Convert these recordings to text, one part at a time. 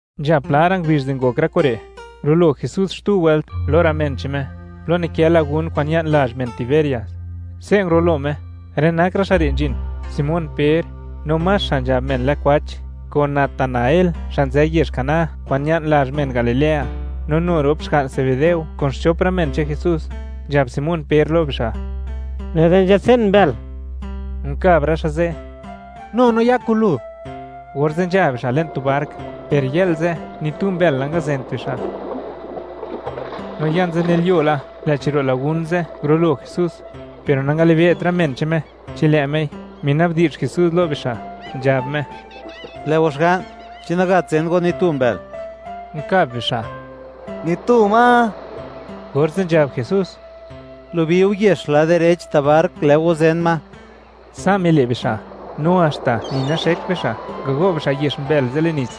Nzha pla ra' ngubizh di ngok rë kure', ngurulo Jesús xtu wëlt lo rë men che'n Me, plo nikë lagún kwa'n ña'n lazh men Tiberias. Se' ngurulo Me. Rë nak rë xa' re' nzhin: Simón Per, no Max xa' nzhab men lë Kwach, kun Natanael xa' nzë yezh Caná kwa'n ña'n lazh men Galilea, no nu rop xga'n Zebedeo kun xchop rë men che'n Jesús. Nzhab Simón Per lo bixa': ―Lë'da nzhatsen mbël. Unkab rë xa' ze': ―Nu no ya kun lu. Orze' nzha bixa' le'n tu bark, per yë'l ze', ni tu mbël nangazent bixa'. No ya nzënilyuo la, lë'chi ro' lagun ze' ngurulo Jesús, per nangalibe't rë men che'n Me chi lë' Mei. Mina'bdi'zh Jesús lo bixa', nzhab Me: ―Lë' go xga'n, ¿chi nagat zen go ni tu mbël? Unkab bixa': ―Ni tu ma. Orze' nzhab Jesús: ―Gulubiu yex lad direch ta' bark, lë' go zen ma. Sa' mile' bixa', no haxta ni naxekt bixa' ngago' bixa' yex mbël ze' le'n nits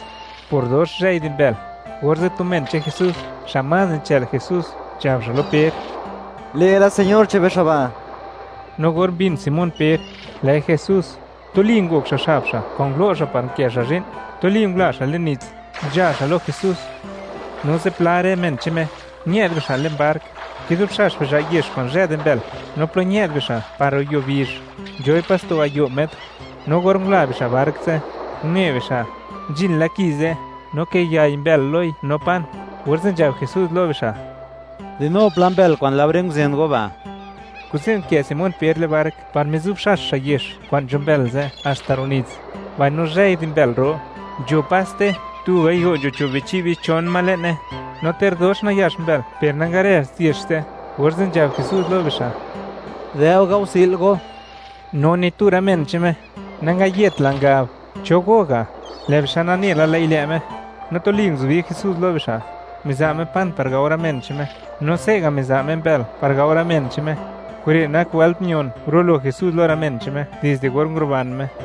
por dox zhëi di mbël. Orze' tu men che'n Jesús xa' más nichë'l Jesús, nzhab xa' lo Per: ―¡Lë'la Señor che'n be xa' ba'! No or mbin Simón Per, lë'i Jesús, tuli ngok xa' xab xa' kwa'n ngulo' xa' par unkë xa' zhi'n, tuli ngula xa' le'n nits, nzha xa' lo Jesús. No zipla rë men che'n Me, ñë'd bixa' le'n bark, kizubxax bixa' yex kwa'n zhë di mbël, no plo ñë'd bixa' par ro' yuo bizh, nzhoi pas tu gayo' metr. No or ngula bixa' bark ze', une bixa', nzhin la ki ze', no kiyay mbël loi no pan. Orze' nzhab Jesús lo bixa': ―Dinou pla mbël kwa'n laore nguzen go ba'. Kuze' nkë Simón Per le'n bark par mizubxax xa' yex kwa'n nzho mbël ze' haxta ro' nits, mbaino zhëi di mbël ro; nzho paste tu gayo' nzho cho' bichi' bichon ma le'ne; no ter dox nayax mbël per nangarëzt yex ze'. Orze' nzhab Jesús lo bixa': ―Dë'u gaosi'l go. No ni tu rë men che'n Me, nangayetla, ngab: “¿Cho go ga'?” Lë' bixa' nane la, lë'i lë' Me. No tuli nguzubi Jesús lo bixa', miza' Me pan par gao rë men che'n Me; no se' ga' miza' Me mbël par gao rë men che'n Me. Kure' nak wëlt mion ngurulo Jesús lo rë men che'n Me dizde or nguruban Me.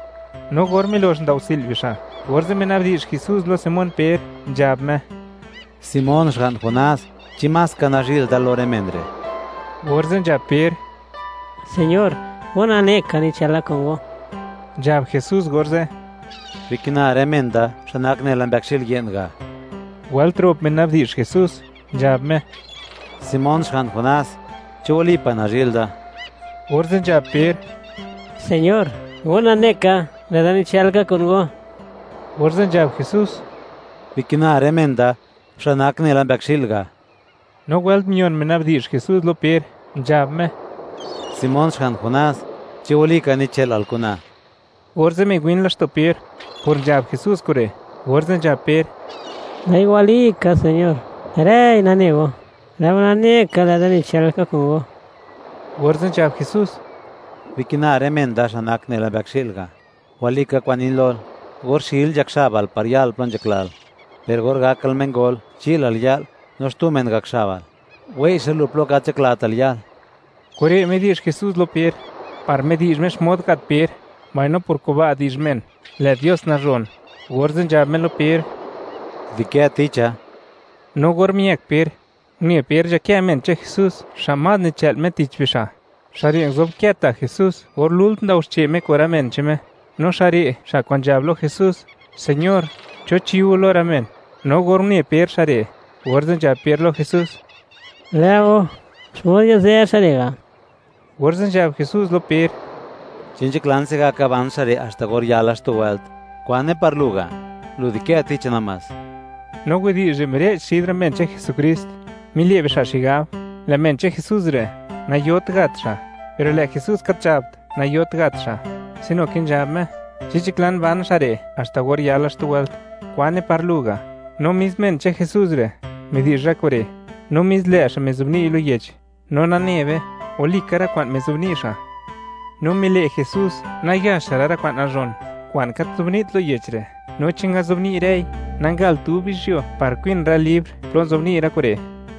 No or milox ndaosi'l bixa', orze' mina'bdi'zh Jesús lo Simón Per, nzhab Me: ―Simón, xga'n Jonás, ¿chi más ka nazhi'l da lo rë men re'? Orze' nzhab Per: ―Señor; Go nane ka, nichëla kun Go. Nzhab Jesús orze': ―Bikina rë men da, xa' nak nela mbëkxi'l ye'n ga'. Wëlt rop mina'bdi'zh Jesús, nzhab Me: ―Simón, xga'n Jonás, ¿chi walipa' nazhi'l da? Orze' nzhab Per: ―Señor; go nane ka, lë'da nichël ka kun Go. Orze' nzhab Jesús: ―Bikina rë men da, xa' nak nela mbëkxi'l ga'. No wëlt mion, mina'bdi'zh Jesús lo Per, nzhab Me: ―Simón, xga'n Jonás, ¿chi walikal nichë'lal kuna? Orze' miwin laxto' Per por nzhab Jesús kure', orze' nzhab Per: ―Lë'i walika Señor; rëi nane Go, lë' Go nane ka lë'da nichël ka kun Go. Orze' nzhab Jesús: ―Bikina rë men da xa' nak nela mbëkxi'l ga'. Walika kwa'n nin lol, or xil, nzhak xabal par yal plo nzhaklal; per or gakal mengol, chi'lal ya'l no xtu men gak xabal, wei' xa' lu plo gat nzhaklatal yal. Kure' midi'zh Jesús lo Per, par midi'zh Me xmod gat Per, mbaino por kuba' di'zh men, lë' Dios nazhon. Orze' nzhab Me lo Per: ―Di'kë ticha. No or miëk Per, une Per nzhakë men che'n Jesús xa' más nichë'l Me tich bixa'. Xa' re' nguzobkë ta' Jesús or lult ndao xche' Me kun rë men che'n Me, no xa' re' xa' kwa'n nzhab lo Jesús: “Señor, ¿cho chi go lo rë men?” No or une Per xa' re', orze' nzhab Per lo Jesús: ―Lë'o, ¿xmod yazë xa' re' ga'? Orze' nzhab Jesús lo Per: ―Chi nzhaklan se'gaka ban xa' re' haxta or yala xtu wëlt, ¿kwane par lu ga'? Lu di'kë ticha namás. No widi'zh re' mire'ch xid rë men che'n Jesukrist, mile' bixa' xigab, lë' men che'n Jesús re', nayot gat xa', per lë' Jesús gat nzhabt, nayot gat xa', sino ke nzhab Me: “Chi nzhaklan ban xa' re' haxta or yala xtu wëlt, ¿kwane par lu ga'?” No mis men che'n Jesús re', midi'zh rë kure', no mis lë' xa' mizobni'y lo yech; no nane be, walika rë kwa'n mizobni' xa'. No mile' Jesús nayaxra' rë kwa'n nazhon kwa'n gat nzobni't lo yech re', no chi ngazobni' rëi, nagalt dub yizhyuo par kwin rë libr plo ngazobni' rë kure'.